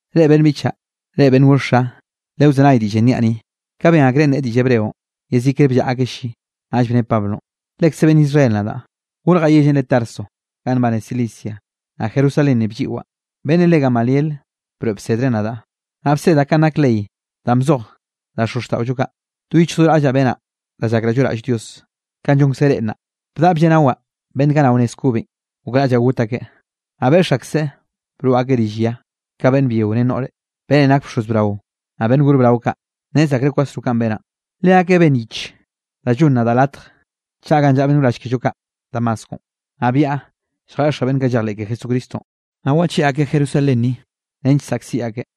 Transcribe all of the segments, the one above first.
—Reꞌ beꞌnn biꞌchaꞌ, reꞌ beꞌnn gor xa, le wzenay diꞌllenꞌ niaꞌ ni. Ka ben akreꞌ nneꞌe diꞌll hebreonꞌ, yezikre bllaꞌa akeꞌ lli. Naꞌll bne Pablonꞌ: —Lekze beꞌnn Israel nadaꞌ, gorjaꞌ yellenꞌ re Tarso ganꞌ nbane Cilicia, naꞌ Jerusalén ni blliꞌwaꞌ, beꞌnnenꞌ re Gamaliel broeꞌ bsedreꞌ nadaꞌ, naꞌ bsedaꞌ kanꞌ nak ley danꞌ bzoj da xozxtaꞌollo kaꞌ. Do yichj do raꞌllaꞌ benaꞌ da llakraꞌ lloꞌraꞌll Dios, kanꞌ llonkze reꞌ nnaꞌ. Bdaꞌa blleꞌnawaꞌ beꞌnn kaꞌ nao nez kobenꞌ, gokraꞌllaꞌ got akeꞌ, naꞌ beꞌx akseꞌ broꞌ akeꞌ rill ya ka beꞌnn byio ren noꞌre. Beꞌnnenꞌ nak bxoz brao, naꞌ beꞌnn gor brao kaꞌ, nnez akreꞌ kwasro kanꞌ benaꞌ. Leakeꞌ benn yich da llonn nadaꞌ latj chaꞌa ganꞌ llaꞌa beꞌnn wrall kello kaꞌ Damasco. Naꞌ byaꞌa lljeꞌxaꞌ beꞌnn kaꞌ llejleꞌ ke Jesucristonꞌ, naꞌ wacheꞌe akeꞌ Jerusalén ni, nench saꞌkziꞌ akeꞌ.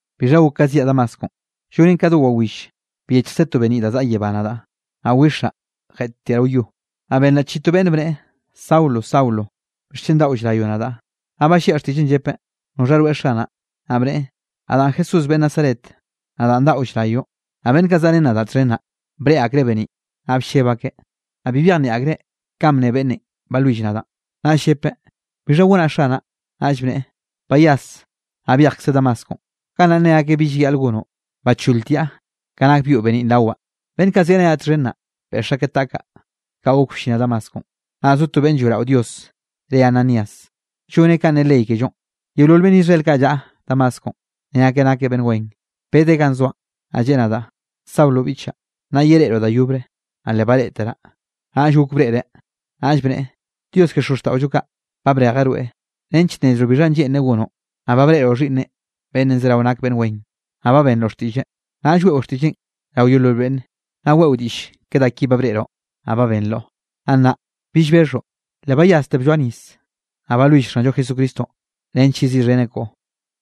’Bixha gok ka zyaꞌ Damasco, llonen ka do wawill byechjkze to beniꞌ da zaꞌa yebá nadaꞌ. Naꞌ wixaꞌ jeꞌttiaꞌ rao yo, naꞌ benraꞌ chiꞌi to beꞌnn bneꞌe: “Saulo, Saulo, ¿bixchen daꞌo llrayoꞌ nadaꞌ?” Naꞌll balliaꞌ xtiꞌlleꞌn, llepeꞌ: “¿Noxha rweꞌ Xanaꞌ?” Naꞌ bneꞌe: “Nadaꞌn Jesús beꞌnn Nazaret, nadaꞌn daꞌo llrayoꞌ.” Naꞌ beꞌnn kaꞌ zaꞌrén nadaꞌ txhen naꞌ breꞌe akreꞌ beniꞌn, naꞌ blleb akeꞌ, naꞌ bi byejnieꞌ akreꞌ kanꞌ bne beꞌnnenꞌ balwill nadaꞌn. Naꞌll llepeꞌ: “¿Bixha gonaꞌ, Xanaꞌ?” Naꞌll bneꞌe: “Bayas, naꞌ byejkze Damasconꞌ. Gannaꞌ nne akeꞌ bi llayaꞌl gonoꞌ.” Bacholtiaꞌ ka nak byoꞌ beniꞌn rawaꞌ. Beꞌnn kaꞌ zyaꞌrenaꞌ txhen naꞌ, beꞌx akeꞌ taꞌkaꞌ, kaꞌ gok bllinaꞌ Damasconꞌ. ’Naꞌ zo to beꞌnn lloeꞌrao Dios re Ananías, lloneꞌ kanꞌ ne ley kellonꞌ. Yeolol beꞌnn Israel kaꞌ llaꞌa Damasconꞌ, ne akeꞌ nakeꞌ beꞌnn wen. Bedeꞌ ganꞌ zoaꞌn, naꞌ lleꞌe nadaꞌ: “Saulo biꞌchaꞌ, nnaꞌ yereꞌroꞌ da yobre.” Naꞌ le bareꞌteraꞌ, naꞌll gok breꞌreꞌ. Naꞌll bneꞌe: “Dios ke xozxtaꞌollo kaꞌ, ba brejeꞌ rweꞌ nench nnezroꞌ bixhanꞌ lleꞌnreꞌ gonoꞌ, naꞌ ba breꞌroꞌ Xhiꞌnneꞌ beꞌnn zerao nak beꞌnn wen, naꞌ ba benroꞌ xtiꞌlleꞌ. Naꞌll weꞌo xtiꞌlleꞌn rao yeolol beꞌnne, naꞌ weꞌo diꞌll ke da ki ba breꞌroꞌ, naꞌ ba benroꞌ. Naꞌ nnaꞌ, ¿bi llbexhoꞌ? Le bayasteꞌ blloa nis, naꞌ balwill Xanllo Jesucristonꞌ nench yeziꞌxheneꞌ koꞌo.”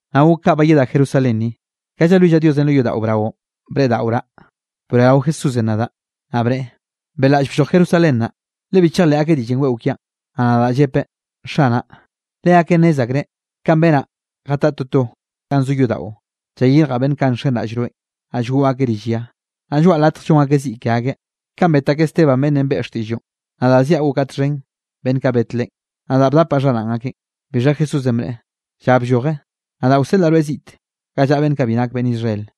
’Naꞌ gok ka bayedaꞌ Jerusalén ni, ka llalwillaꞌ Dios lo yodaꞌo braonꞌ breꞌdaꞌoraꞌ, broeꞌrao Jesúsenꞌ nadaꞌ. Naꞌ bneꞌe: “Beꞌlaꞌll blloj Jerusalén naꞌ, le bi chejleꞌ akeꞌ diꞌllenꞌ weꞌo kiaꞌn.” Naꞌ nadaꞌ llepeꞌ: “Xanaꞌ, leakeꞌ nnez akreꞌ kanꞌ benaꞌ jataꞌa toto ganꞌ zo yodaꞌo, llayirjaꞌ beꞌnn kaꞌ nxenraꞌll rweꞌn, naꞌ llgoꞌ akeꞌ rill ya, naꞌ lloaꞌ latj llon akeꞌ ziꞌ ke akeꞌ. Kanꞌ bet akeꞌ Esteban beꞌnnenꞌ beꞌe xtiꞌlloꞌn, nadaꞌ ziaꞌ gokaꞌ txhen beꞌnn kaꞌ bet leꞌen, nadaꞌ bdapaꞌ xharaꞌn akeꞌn.” Bixha Jesúsenꞌ bneꞌe: “Lla blloje, nadaꞌ wseꞌlaꞌ rweꞌ ziꞌte ga llaꞌa beꞌnn kaꞌ bi nak beꞌnn Israel.”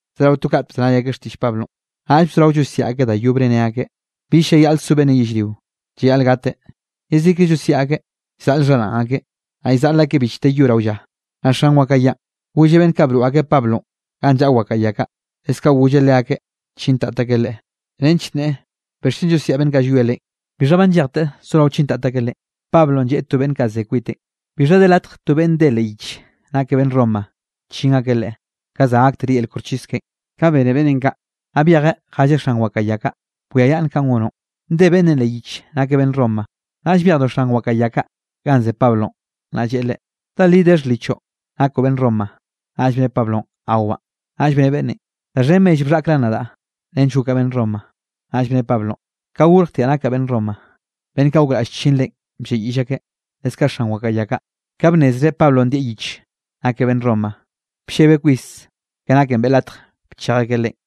Zerao to kat bzenay akeꞌ xtiꞌll Pablonꞌ, naꞌll bzorao llosiaꞌ akeꞌ da yobre ne akeꞌ: —¡Bill llayaꞌl so beꞌnnenꞌ yellrio, llayaꞌl gateꞌ! Yezikre llosiaꞌ akeꞌ, llzaꞌl xharaꞌn akeꞌ, naꞌ llzaꞌl akeꞌ bichte yo rao lla. Naꞌ xan wakaꞌa yanꞌ golleꞌ beꞌnn kaꞌ broꞌ akeꞌ Pablonꞌ ganꞌ llaꞌa wakaꞌa ya kaꞌ, leskaꞌ golleꞌ leakeꞌ chintat akeꞌ leꞌe, nench nneꞌe bixchen llosiaꞌ beꞌnn kaꞌ llwie leꞌen. Bixha ba nllejteꞌ sorao chintat akeꞌ leꞌen, Pablonꞌ lleꞌe to beꞌnn kaꞌ ze kwiteꞌn: —¿Bixha de latj to beꞌnn nde leꞌ yich nakeꞌ beꞌnn Roma chin akeꞌ leꞌe, ka za gaktere yel koxchis keꞌen? Ka bene beꞌnnenꞌ kaꞌ, naꞌ byejeꞌ jelleꞌ xan wakaꞌa ya kaꞌ: —Bwiayaꞌnn kanꞌ gonoꞌn, nde beꞌnnenꞌ leꞌ yich nakeꞌ beꞌnn Roma. Naꞌll byejdo xan wakaꞌa ya kaꞌ ganꞌ ze Pablonꞌ, naꞌ lleꞌe leꞌe: —¿Da li de xhlichoꞌ nakoꞌ beꞌnn Roma? Naꞌll bne Pablonꞌ: —Awaꞌ. Naꞌll bne beꞌnnenꞌ: —Da xhen mell bxhaꞌkraꞌn nadaꞌ nench gokaꞌ beꞌnn Roma. Naꞌll bne Pablonꞌ: —Ka gorjtiaꞌ nakaꞌ beꞌnn Roma. Beꞌnn kaꞌ gokraꞌll chin leꞌen blleꞌyiꞌll akeꞌ, leskaꞌ xan wakaꞌa ya kaꞌ, ka bnnezreꞌ Pablonꞌ ndieꞌ yich nakeꞌ beꞌnn Roma, bllebeꞌ kwis ke naken beꞌe latj bchej akeꞌ leꞌen.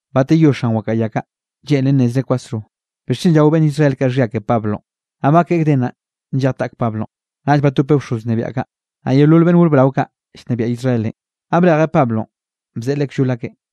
Bateyó xan wakaꞌa ya kaꞌ, lleꞌnreꞌ nnezreꞌ kwasro bixchen llao beꞌnn Israel kaꞌ xhia ke Pablonꞌ. Naꞌ bakeꞌe gden naꞌ, nllej taꞌk Pablonꞌ, naꞌll batopeꞌ bxoz wnebiaꞌ kaꞌ, naꞌ yeolol beꞌnn gor brao kaꞌ llnebiaꞌ Israelenꞌ, naꞌ brejeꞌ Pablonꞌ bzeꞌe leꞌe kllol akeꞌn.